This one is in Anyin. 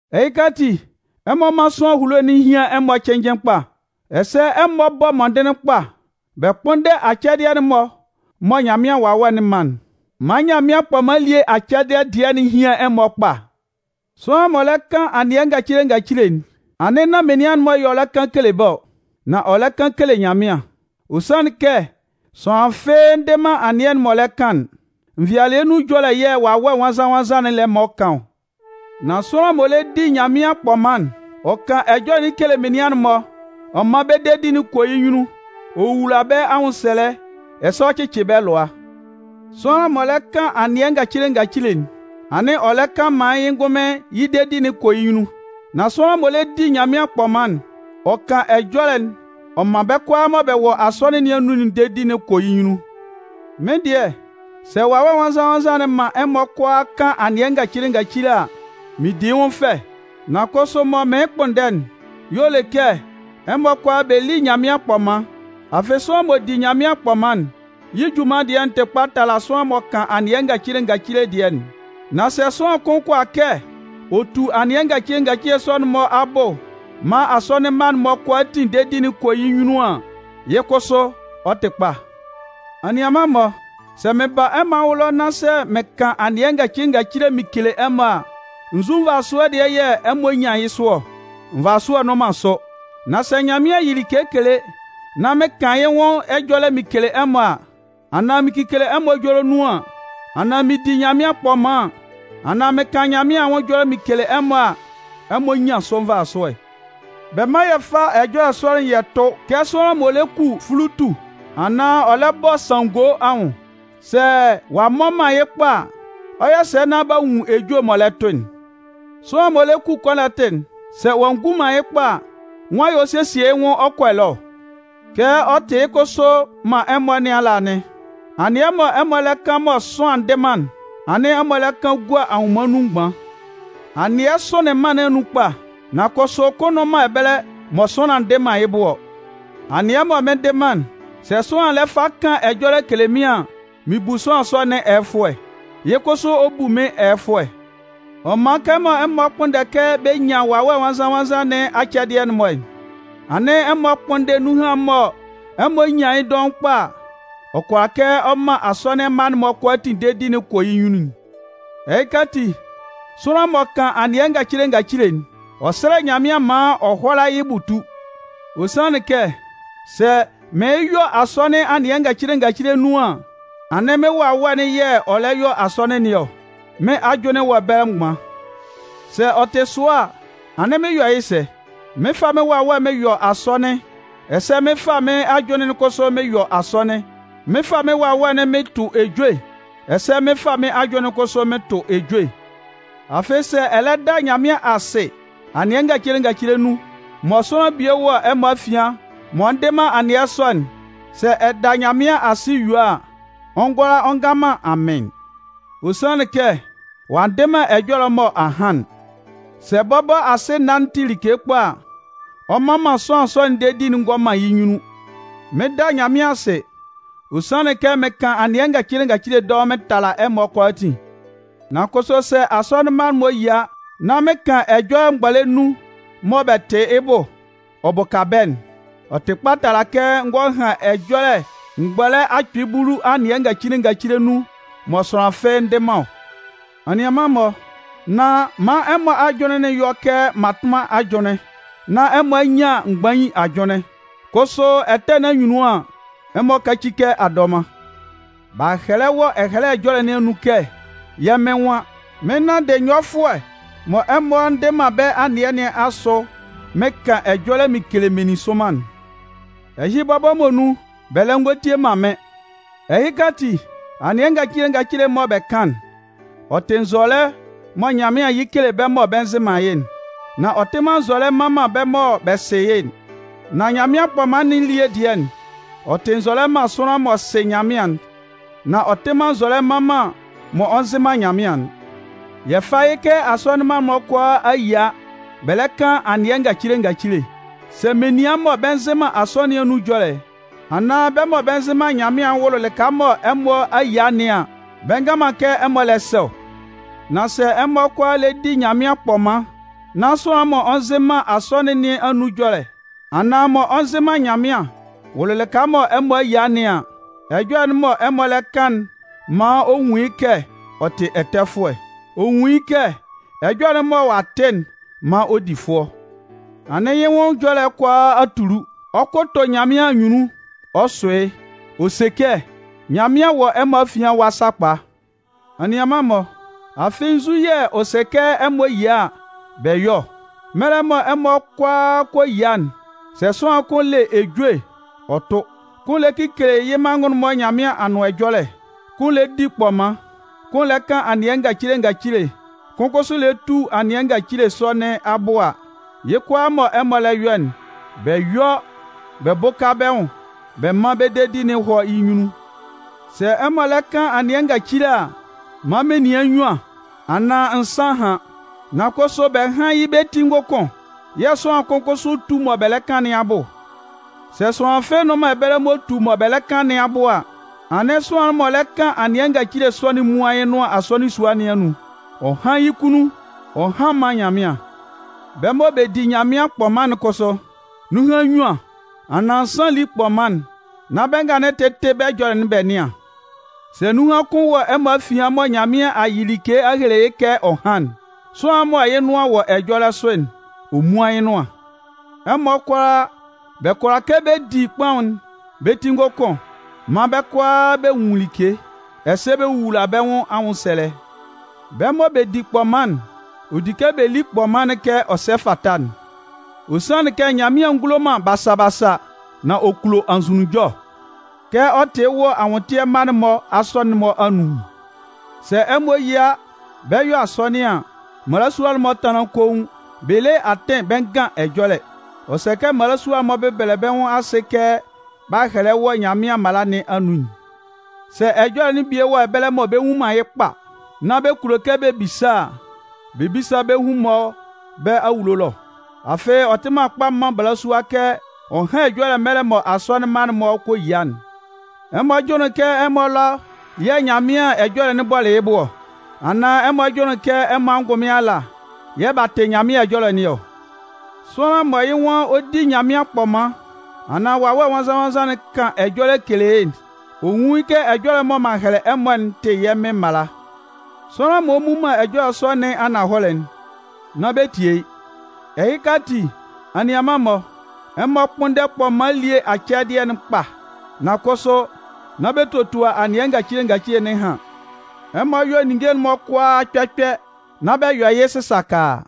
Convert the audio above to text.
Ɛhɩka ati, ɛmɔ mán sʋanlan ehulo'n hían ɛmɔ cɩnnjɩn kpa. Ɛsɛ ɛmɔ bɔ́ mɔndɩnlɩn kpa bɛ kpʋ́nndɛ acɛdɩɛ'n-mɔ mɔ Nyanmɩan Wawɛ'n man'n. Man Nyanmɩan kpɔman elie acɛdɩɛ dɩɛ'n hían ɛmɔ kpa. Sʋanlan m'ɔ lɛ kan anɩɛ ngacile ngacile'n, anɩn nán menian-mɔ y'ɔ lɛ kan kele bɛ́ ɔ, nan ɔ lɛ kan kele Nyanmɩan. Ɔ sanlɩn kɛ sʋanlan fɩ́ɩ́ ndɩ man anɩɛ'n m'ɔ lɛ kan'n. Nvɩalɩɛ nun ɛjɔlɛ yɛ̂ Wawɛ Nwannzan-nwannzan'n lɛ man ɔ kan ɔ. Nan sʋanlan m'ɔ lɛ di Nyanmɩan kpɔman'n, ɔ kan ɛjɔlɛ'n kele menian'n-mɔ ɔ man bɛ́ dedi'n kɔ yɩ́ nyunnun, ɔ wowula bɛ́ anwʋnsɛlɛ ɛsɛ ɔ cɩcɩ bɛ́ lʋa. Sʋanlan m'ɔ lɛ kan anɩɛ ngacile ngacile'n, anɩn ɔ lɛ kan maan yɩ́ ngʋnmɩn yɩ́ dedi'n kɔ yɩ́ nyunnun. Nan sʋanlan m'ɔ lɛ di Nyanmɩan kpɔman'n, ɔ kan ɛjɔlɛ'n ɔ man bɛ́ kʋalaa mɔ bɛ wɔ asɔnɩn nɩn anun'n dedi'n kɔ yɩ́ nyunnun. Mɩ́n dɩɛ, sɛ Wawɛ Nwannzan-nwannzan'n man ɛmɔ kʋalaa kan anɩɛ ngacile ngacile a, mɩn di yɩ́ nwʋn fɛ. Nan kʋsʋ mɔ mɩɩn kpʋnndɛ'n, y'ɔ le kɛ ɛmɔ kʋalaa bɛ lí Nyanmɩan kpɔman. Afɩ sʋanlan m'ɔ di Nyanmɩan kpɔman'n, yɩ́ junman dɩɛ'n tɩ kpa tala sʋanlan mɔ kan anɩɛ ngacile ngacile'n dɩɛ'n. Nan sɛ sʋanlan kʋn kʋala kɛ ɔ tutu anɩɛ ngacile ngacile sɔ'n-mɔ abʋ maan Asɔnɩn mma'n-mɔ kʋalaatin dedi'n kɔ yɩ́ nyunnun an, yɩ́ kʋsʋ ɔ tɩ kpa. Anianman-mɔ, sɛ mɩn ba ɛmɔ anwʋn ɛlɔ, nán sɛ mɩn kan anɩɛ ngacile ngacile mɩn kele ɛmɔ a, nzu nvasʋɛ dɩɛ yɛ̂ ɛmɔ 'nyan yɩ́ sʋ ɔ? Nvasʋɛ nnʋn man sʋ. Nan sɛ Nyanmɩan yɩ like kele nán mɩn kan yɩ́ nwʋn ɛjɔlɛ mɩn kele ɛmɔ a, anaan mɩn kekele ɛmɔ ɛjɔlɛ nun an, anaan mɩn di Nyanmɩan kpɔman an, anaan mɩn kan Nyanmɩan anwʋn ɛjɔlɛ mɩn kele ɛmɔ a, ɛmɔ 'nyan sʋ nvasʋɛ. Bɛ mán yɛ fá ɛjɔlɛ sɔ'n yɛ tʋ́ kɛ sʋanlan m'ɔ le ku fulutu anaan ɔ lɛ bɔ sanngo anwʋn. Sɛ ɔ'a mmɔ man yɩ́ kpa a, ɔ 'yɔ sɛ nán b'a nwun ejue'n m'ɔ lɛ tʋ'n? Sʋanlan m'ɔ lɛ ku kɔnɔtɩ'n, sɛ ɔ'a ngu man yɩ́ kpa a, nwan yɛ̂ ɔ 'sesie yɩ́ nwʋn ɔ kɔ ɛlɔɛ ɔ? Kɛ ɔ tɩ yɩ́ kʋsʋ man ɛmɔ nɩn ala anɩn. Anɩɛ mɔ ɛmɔ lɛ kan mɔ sʋanlan ndɩ man'n, anɩn ɛmɔ lɛ kan gua anwʋnman nun mgban. Anɩɛ sʋnlɩn mân nɩn anun kpa, nan kʋsʋ kʋn nnʋn man ɛbɛlɛ mɔ sʋanlan ndɩ man yɩ́ bʋ ɔ. Anɩɛ mɔ mɩn ndɩ man'n, sɛ sʋanlan lɛ fa kan ɛjɔlɛ kele mɩ́n an, mɩn bu sʋanlan sɔ nɩn ɛyɛfʋɛ, yɩ́ kʋsʋ ɔ bu mɩ́n ɛyɛfʋɛ. Ɔ man, kɛmɔ ɛmɔ kpʋnndɛ kɛ bɛ nyan Wawɛ Nwannzan-nwannzan nɩn acɛdɩɛ'n-mɔ'n, anɩn ɛmɔ kpʋ́nndɛ nunhan mɔ ɛmɔ nyan yɩ́ dɔʋn kpa a, ɔ kʋala kɛ ɔ man Asɔnɩn mma'n-mɔ kʋalaatin dedi'n kɔ yɩ́ nyunnun'n. Ɛhɩka ati, sʋanlan m'ɔ kan anɩɛ ngacile ngacile'n, ɔ sɛ́lɛ Nyanmɩan maan ɔ hʋ́ala yɩ́ bʋ tú. Ɔ sanlɩn kɛ sɛ mɩɩn yɔ asɔnɩn anɩɛ ngacile ngacile nun an, anɩn mɩ́n wawɛ'n yɛ̂ ɔ lɛ yɔ asɔnɩn nɩn ɔ, mɩ́n ajʋnlɩn'n wɔ ɛbɛlɛ mgban. Sɛ ɔ tɩ sɔ a, anɩn mɩn 'yɔ yɩ́ sɛ? Mɩn 'fa mɩ́n wawɛ mɩn yɔ asɔnɩn, ɛsɛ mɩn 'fa mɩ́n ajʋnlɩn'n kʋsʋ mɩn yɔ asɔnɩn. Mɩn 'fa mɩ́n wawɛ'n mɩn tʋ ejue, ɛsɛ mɩn 'fa mɩ́n ajʋnlɩn'n kʋsʋ mɩn tʋ ejue. Afɩ sɛ ɛ lɛ da Nyanmɩan asɩ anɩɛ ngacile ngacile nun, mɔ sʋanlan bie wɔ ɛmɔ afian m'ɔ ndɩ man anɩɛ sɔ'n, sɛ ɛ da Nyanmɩan asɩ yue a, ɔ ngʋala ɔ ngan man “Amɩn”, ɔ sanlɩn kɛ ɔ'a ndɩ man ɛjɔlɛ'n mɔ a han'n. Sɛ bɔbɔ asɩna'n tɩ like kpa a, ɔ mman man sʋanlan sɔ'n dedi'n ngɔ man yɩ́ nyunnun. Mɩn 'da Nyanmɩan asɩ, ɔ sanlɩn kɛ mɩn kan anɩɛ ngacile ngacile dɔʋn mɩn tala ɛmɔ kʋalaatin. Nan kʋsʋ sɛ Asɔnɩn mma'n-mɔ yia nán mɩn kan ɛjɔlɛ mgbɔlɛ nnun mɔ bɛ tɩ yɩ́ bʋ, ɔ bʋka bɛ́'n, ɔ tɩ kpa tala kɛ n gɔ han ɛjɔlɛ mgbɔlɛ akpɩɩ bulu anɩɛ ngacile ngacile nun mɔ sʋanlan fɩ́ɩ́ ndɩ man ɔ. Anianman-mɔ, nán man ɛmɔ ajʋnlɩn'n yɔ kɛ mmatʋnman ajʋnlɩn, nan ɛmɔ nyán mgbain ajʋnlɩn. Kʋsʋ ɛtɛ nɩn anyunnun an, ɛmɔ káci kɛ adɔman. B'a hɛlɛ wɔ Ɛhɛlɛ Ɛjɔlɛ nɩn anun kɛ yɛ́ Mɩn nwan: Mɩn 'nanndɩ nyɔfʋɛ mɔ ɛmɔ ndɩ man bɛ́ anɩɛ nɩn asʋ, mɩn kan ɛjɔlɛ mɩn kele meninsʋnman'n. Ɛhɩ bɔbɔ muonun, bɛ lɛ ngɔ tie man mɩ́n. Ɛhɩka ati, anɩɛ ngacile ngacile'n mɔ bɛ kan'n, ɔ tɩ nzɔlɛ mɔ Nyanmɩan yɩ kele bɛ́ mɔ bɛ nzɩ man yɩ́'n, nan ɔ tɩ man nzɔlɛ mman man bɛ́ mɔ bɛ sɩ yɩ́'n, nan Nyanmɩan kpɔman nɩn elie dɩɛ'n, ɔ tɩ nzɔlɛ man sʋanlan'n m'ɔ sɩ Nyanmɩan'n, nan ɔ tɩ man nzɔlɛ mman man m'ɔ nzɩ man Nyanmɩan'n. Yɛ fá yɩ́ kɛ asɔnɩn mma'n-mɔ kʋalaa a yia bɛ lɛ kan anɩɛ ngacile ngacile. Sɛ menian mɔ bɛ nzɩ man asɔnɩn nɩn anun ɛjɔlɛ, anaan bɛ́ mɔ bɛ nzɩ man Nyanmɩan'n wʋlʋ lɩka mɔ ɛmɔ a yia nɩn an, bɛ ngan man kɛ ɛmɔ lɛ sɛ ɔ? Nan sɛ ɛmɔ kʋalaa lɛ di Nyanmɩan kpɔman nán sʋanlan m'ɔ nzɩ man asɔnɩn nɩn anun ɛjɔlɛ, anaan m'ɔ nzɩ man Nyanmɩan wʋlʋ lɩka mɔ ɛmɔ a yia nɩn an, ɛjɔlɛ'n mɔ ɛmɔ lɛ kan'n maan ɔ nwʋn yɩ́ kɛ ɔ tɩ ɛtɛfʋɛ. Ɔ nwun yɩ́ kɛ ɛjɔlɛ'n mɔ ɔ'a tɩ'n maan ɔ di fʋɔ. Anɩn yɩ́ nwʋn ɛjɔlɛ kʋalaa a tulu. Ɔ 'kʋtʋ Nyanmɩan anyunnun ɔ sʋ yɩ́, ɔ se kɛ: “Nyanmɩan wɔ ɛmɔ afian ɛwa sakpa!” Anianman-mɔ, afɩ nzu yɛ̂ ɔ sɛ kɛ ɛmɔ yia a, bɛ yɔ́ ɔ? Mɛlɛ mɔ ɛmɔ kʋalaa kɔ yia'n, sɛ sʋanlan kʋn le ejue ɔ tʋ, kʋn lɛ kekele yɩ́ manngʋn'n-mɔ Nyanmɩan Anʋan Ɛjɔlɛ, kʋn lɛ di kpɔman, kʋn lɛ kan anɩɛ ngacile ngacile, kʋn kʋsʋ lɛ tu anɩɛ ngacile sɔ nɩn abʋ a, yɩ́ kʋalaa mɔ ɛmɔ lɛ yɔ'n, bɛ yɔ́ bɛ bʋ́ka bɛ́ nwʋn bɛ mán bɛ́ dedi'n hɔ́ yɩ́ nyunnun. Sɛ ɛmɔ lɛ kan anɩɛ ngacile a, man menian nnyuan anaan nsan hán. Nan kʋsʋ bɛ hán yɩ́ bɛ́ ti ngʋkʋn, yɛ̂ sʋanlan kʋn kʋsʋ tú mɔ bɛ lɛ kan nɩn abʋ. Sɛ sʋanlan fɩ́ɩ́ nnʋn man ɛbɛlɛ m'ɔ tu mɔ bɛ lɛ kan nɩn abʋ a, anɩn sʋanlan'n m'ɔ lɛ kan anɩɛ ngacile sɔ'n múan yɩ́ nʋan Asɔnɩn sua nɩn anun. Ɔ hán yɩ́ kunnun, ɔ hán mán Nyanmɩan. Bɛ́ mɔ bɛ di Nyanmɩan kpɔman'n kʋsʋ, nunhan nnyuan, anaan nsan lí kpɔman'n nán bɛ́ nga'n tɩ́tɩ bɛ́ ɛjɔlɛ'n bɛ nɩ́an. Sɛ nunhan kʋn wɔ ɛmɔ afian mɔ Nyanmɩan a yɩ like a hele yɩ́ kɛ ɔ hán'n, sʋanlan'n mɔ yɩ́ nʋan wɔ ɛjɔlɛ sʋ'n, ɔ múan yɩ́ nʋan. Ɛmɔ kʋalaa, bɛ kʋala kɛ bɛ di kpɔman'n bɛ́ ti ngʋkʋn maan bɛ́ kʋalaa bɛ nwun like, ɛsɛ bɛ wowula bɛ́ nwʋn anwʋnsɛlɛ. Bɛ́ mɔ bɛ di kpɔman'n, ɔ di kɛ bɛ lí kpɔman'n kɛ ɔ sɛ fata'n. Ɔ sanlɩn kɛ Nyanmɩan ngulo man basa basa, nan ɔ kulo anzʋnunjɔ. Kɛ ɔ tɩ yɩ́ wɔ anwʋntɩɛ mma'n-mɔ asɔnɩn'n-mɔ anun'n, sɛ ɛmɔ yia nán bɛ́ 'yɔ asɔnɩn an, mmalasua'n-mɔ tánlan koun, bɛ le atɩn bɛ ngan ɛjɔlɛ. Ɔ sɛ kɛ mmalasua'n-mɔ bɛ́bɛlɛ bɛ́ nwʋn asɩ kɛ b'a hɛlɛ wɔ Nyanmɩan mala nɩn anun'n. Sɛ Ɛjɔlɛ'n bie wɔ ɛbɛlɛ mɔ bɛ nnwun man yɩ́ kpa, nán bɛ kulo kɛ bɛ bisa a, bɛ bísa bɛ́ hun-mɔ bɛ́ awulo ɛlɔ. Afɩ ɔ tɩ man kpa man balasua kɛ ɔ hán ɛjɔlɛ mɛlɛ mɔ Asɔnɩn mma'n-mɔ kɔ yia'n. Ɛmɔ jʋnlɩn kɛ ɛmɔ ɛlɔ yɛ̂ Nyanmɩan ɛjɔlɛ'n bɔlɩ yɩ́ bʋ ɔ? Anaan ɛmɔ jʋnlɩn kɛ ɛmɔ ngʋnmɩn ala yɛ̂ b'a tɩ Nyanmɩan ɛjɔlɛ nɩn ɔ? Sʋanlan mɔ yɩ́ nwan ɔ di Nyanmɩan kpɔman, anaan Wawɛ Nwannzan-nwannzan kan ɛjɔlɛ kele yɩ́'n, ɔ nwún yɩ́ kɛ ɛjɔlɛ'n mɔ m'an hɛlɛ ɛmɔ'n tɩ yɛ́ Mɩn mala. Sʋanlan m'ɔ mmu man ɛjɔlɛ sɔ nɩn ananhɔlɛ'n, nán bɛ tie yɩ́. Ɛhɩka ati, anianman-mɔ, ɛmɔ kpʋ́nndɛ kpɔman elie acɛdɩɛ'n kpa. Nan kʋsʋ, nán bɛ totua anɩɛ ngacile ngacile nɩn ɛhan. Ɛmɔ yɔ́ ninnge'n-mɔ kʋalaa kpɛ kpɛ, nán bɛ yɔ yɩ́ sɩsakaa.